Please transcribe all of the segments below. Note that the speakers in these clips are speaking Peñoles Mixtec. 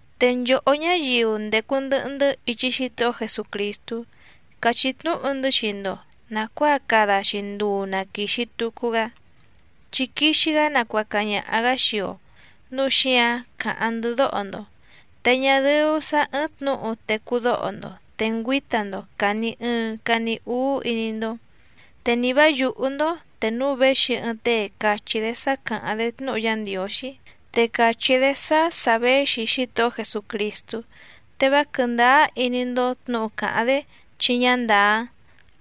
Te nchòhó ñáyiu ndècu ndɨhɨ‑ndɨ́ ichi Xítohó Jesucrìstú càchí tnúhu‑ndɨ́ xii‑ndo nàcuáa cada‑xi nduu na quìxi tucu‑gá, chi quixi‑gá nacuaca ñaha‑gǎ xii‑o, núu xíǎⁿ càháⁿ‑ndɨ́ dóho‑ndo. Te ñá dɨ́ú sǎ ɨ́ɨ́ⁿ tnǔhu tecú dóho‑ndo te ngüíta‑ndo càni ɨɨⁿ cani úú iní‑ndó, te ni vǎ yùhú‑ndó te núu véxi ɨɨⁿ tée càchí‑dé sá càháⁿ‑dé tnúhu Yá Ndiǒxí, te càchí‑dé sá sà véxi Xítohó Jesucrìstú, te vá quɨ̀ndáá iní‑ndó tnǔhu càháⁿ‑dé chi ñá ndàá,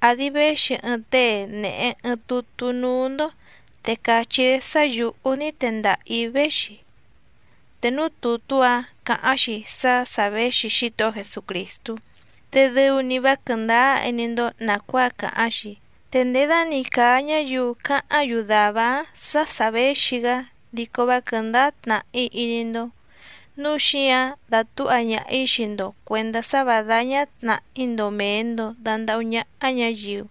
àdi véxi ɨɨⁿ tée nèhe ɨɨⁿ tutú núú‑ndó te càchí‑dé sá yǔhú ní tendaha‑ǐ véxi, te núú tùtú‑áⁿ càháⁿ‑xi sá sà véxi Xítohó Jesucrìstú, te dɨu‑ni vá quɨ̀ndáá iní‑ndó nàcuáa càháⁿ‑xi, te nděda‑ni càa ñáyiu cáháⁿ‑yu dàvá‑áⁿ sǎ sà véxi‑gá dico vá quɨ̀ndáá tnàhí iní‑ndó. Núu xíǎⁿ dátǔha ñaha‑ǐ xii‑ndo cuèndá sá vǎ dáñá tnàhí‑ndo mèe‑ndo dandahú ñáhá ñǎyiu.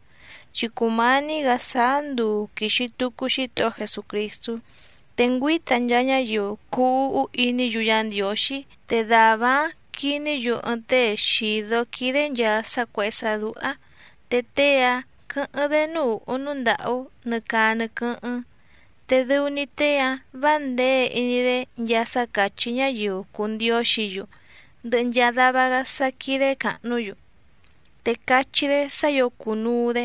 Chi cùmání‑gǎ sáá nduu quìxi tucu Xítohó Jesucrìstú, te ngüíta nchaa ñáyiu cuu úhú iní‑yu Yá Ndiǒxí, te dàvá‑áⁿ quiní‑yu ɨɨⁿ tée xìdó quídé nchàa sá cuèhé sá dúhá, te tée‑áⁿ quɨ̌hɨ́ⁿ‑dé núú ùhú núú ndàhú nɨ caa nɨ quɨ́hɨ́ⁿ. Te dɨu‑ni tée‑áⁿ vǎ nděe iní‑dé nchaa sá càchí ñáyiu cùu ndióxǐ‑yu ndɨhɨ nchaa dava‑gá sá quídé càhnú‑yu, te cachí‑dé sá ǐo cùnuu‑dé,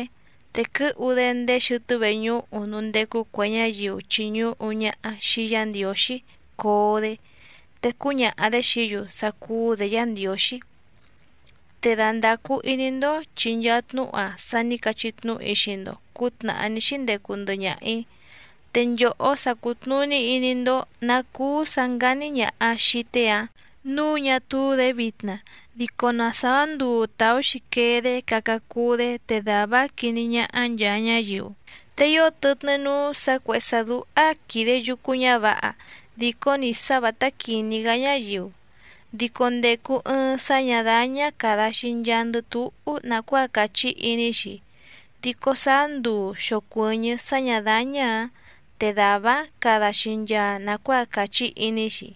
te quɨ́hu‑dé ndéé xɨtɨ́ veñúhu núú ndécú cuè ñáyiu chìñuhu ñaha xii Yá Ndiǒxí coo‑dé, te cúñaha‑dě xií‑yu sá cúú‑dě Yǎ Ndiǒxí. Te dandàcu iní‑ndó chi nchaa tnúhu‑a sa ní cachí tnúhu‑í xii‑ndo cǔtnàhá ní xíndecu ndɨhɨ ñaha‑ǐ. Te nchòhó sa cùtnuní iní‑ndó nǎ cúú sǎ ngání ñàha xii tée‑áⁿ nǔu ñá túú‑dě vitna, dico na sàá nduu tàú‑xi quee‑dé caca cuu‑dé te dàvá‑áⁿ quiní ñáhá nchàa ñáyiu. Te ío tɨtnɨ́ núú sǎ cuèhé sá dúhá quìde yucu ñávǎha dìcó‑ni sá vǎtá quìní‑gá ñáyiu, dico ndècu ɨɨⁿ sá ñǎ dáñá càda‑xi nchaandɨ túhú nàcuáa càchí iní‑xi, dico sáá nduu xòcuɨñɨ́ sá ñǎ dáñá‑ǎⁿ te dàvá‑áⁿ cada‑xi nchaa nàcuáa càchí iní‑xi.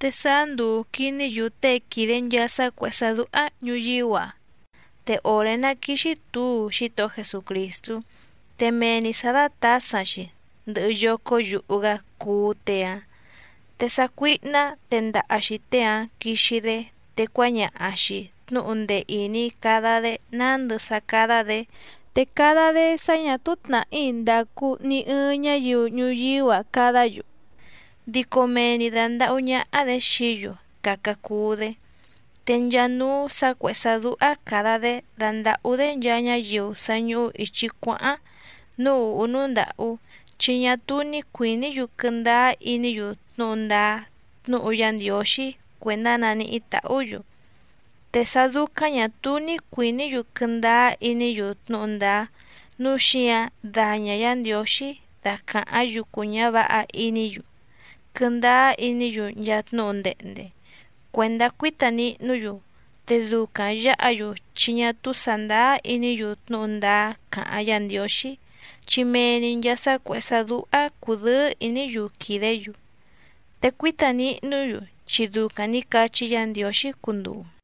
Te sáá nduu quìní‑yu tée quìde nchaa sá cuèhé sá dúhá‑ǎⁿ ñuyíú‑a. Te òré ná quìxi túu Xítohó Jesucrìstú, te mee‑ni sǎ dátǎsaⁿ‑xi, ndɨhɨ yócó yuhu‑gá cuú tée‑áⁿ. Te sácuíhná tendaha‑xi tée‑áⁿ quixi‑dé, te cuáñaha‑xi tnǔhu ndee ìní cada‑dé nándɨ sá cádá‑dě. Te cada‑dé sá ñà túú tnàhí ndàcu ni ɨɨⁿ ñáyiu ñuyíú‑a cadá‑yu, dico mee‑ni dàndahú ñáhá‑dě xií‑yu caca cuu‑dé. Te nchaa núú sǎ cuèhé sá dúhá càda‑dé dandàhú‑dé nchaa ñáyiu sa ñùhu ichi cuáháⁿ núú ùhú núú ndàhú, chi ñá túú ní cuìní‑yu quɨndáá iní‑yu tnúhu ndáá tnúhu Yá Ndiǒxí cuèndá naníhí tàhú‑yu. Te sá dúcáⁿ ñà túú ní cuìní‑yu quɨndáá iní‑yu tnúhu ndáá, núu xíǎⁿ daña Yǎ Ndiǒxí dacàháⁿ yucu ñǎvǎha iní‑yu quɨndáá iní‑yu nchaa tnúhu ndehnde cuèndá cuíta nihnú‑yu, te ducaⁿ yǎha‑yu chi ñá túú sàndáá iní‑yu tnúhu ndáá càháⁿ Yǎ Ndiǒxí, chi mee‑ni nchàa sá cuèhé sá dúhá cùdɨ́ɨ́ ìní‑yu quìdé‑yu, te cuíta nihnú‑yu chi ducaⁿ nǐ cachí Yǎ Ndiǒxí cunduu.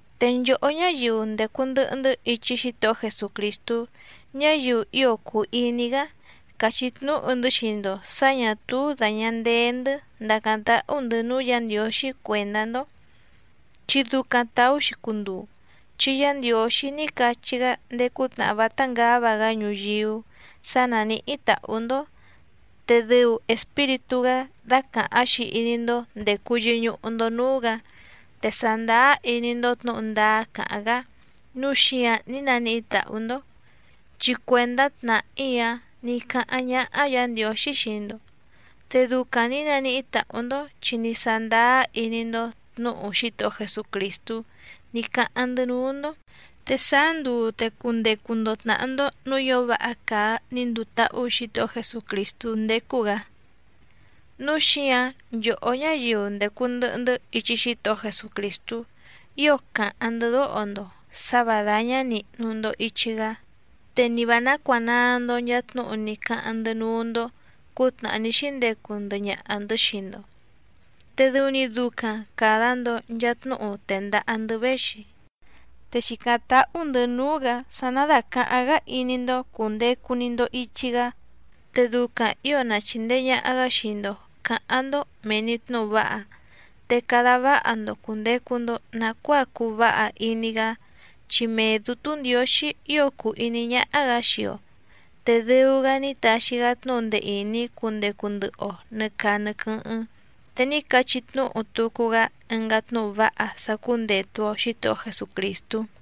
Te nchòhó ñáyiu ndècu ndɨhɨ‑ndɨ́ ichi Xítohó Jesucrìstú, ñáyiu ío cùu iní‑gá càchí tnúhu‑ndɨ́ xii‑ndo sǎ ñà túú dàña ndee‑ndɨ́ ndàcáⁿ táhú‑ndɨ̌ núú Yǎ Ndiǒxí cuèndá‑ndó, chi ducaⁿ tàú‑xi cunduu, chi Yá Ndiǒxí ní cachí‑gá ndéé cútnàhá vátá ngǎva‑gá ñuyíú sǎ nánìhí tàhú‑ndó, te dɨu Espíritú‑gá dácàháⁿ‑xi iní‑ndó ndècu yɨñuhu‑ndo núú‑gǎ, te sàndáá iní‑ndó tnǔhu ndáá càháⁿ‑gá nǔu xíǎⁿ ní naníhí tàhú‑ndó. Chi cuèndá tnàhí‑a ní cáháⁿ ñáhá Yǎ Ndiǒxí xii‑ndo, te ducaⁿ nǐ naníhí tàhú‑ndó chi ní sándáá iní‑ndó tnǔhu Xítohó Jesucrìstú ní cáháⁿ‑ndɨ́ núú‑ndó, te sáá nduu te cundecu‑ndo tnàhá‑ndó nǔú ǐo váha càa ní nduu táhú Xǐtohó Jesucrìstú ndécú‑gǎ. Núu xíǎⁿ nchòhó ñáyiu ndècu ndɨhɨ‑ndɨ́ ichi Xítohó Jesucrìstú ío càháⁿ‑ndɨ́ dóho‑ndo sǎ và dáñá nìhnu‑ndo ichi‑gá, te ni vǎ nácuànaa‑ndo nchaa tnúhu ní cáháⁿ‑ndɨ́ núú‑ndó cǔtnàhá ní xíndecu ndɨhɨ ñaha‑ndɨ̌ xii‑ndo, te dɨu‑ni ducaⁿ càda‑ndo nchaa tnúhu tèndaha‑ndɨ́ véxi. Te xìcáⁿ táhú‑ndɨ̌ núú‑gǎ sá ná dàcaháⁿ‑gá iní‑ndó cùndecu‑ni‑ndo ichi‑gá, te ducaⁿ ǐo na chìndee ñaha‑gá xii‑ndo cǎháⁿ‑ndó mèe‑ni tnúhu váha, te cada váha‑ndo cùndecu‑ndo nacuáa cuu váha iní‑gá, chi mee Dǔtú Ndiǒxí ío cùu iní ñáhá‑gǎ xii‑o, te dɨu‑gá ní taxi‑gá tnúhu ndee ìní cundecu ndɨhɨ‑o nɨ̀ caa nɨ quɨ́hɨ́ⁿ, te ní cachí tnúhu tucu‑gá ɨngá tnúhu váha sá cúndètu‑o Xítohó Jesucrìstú.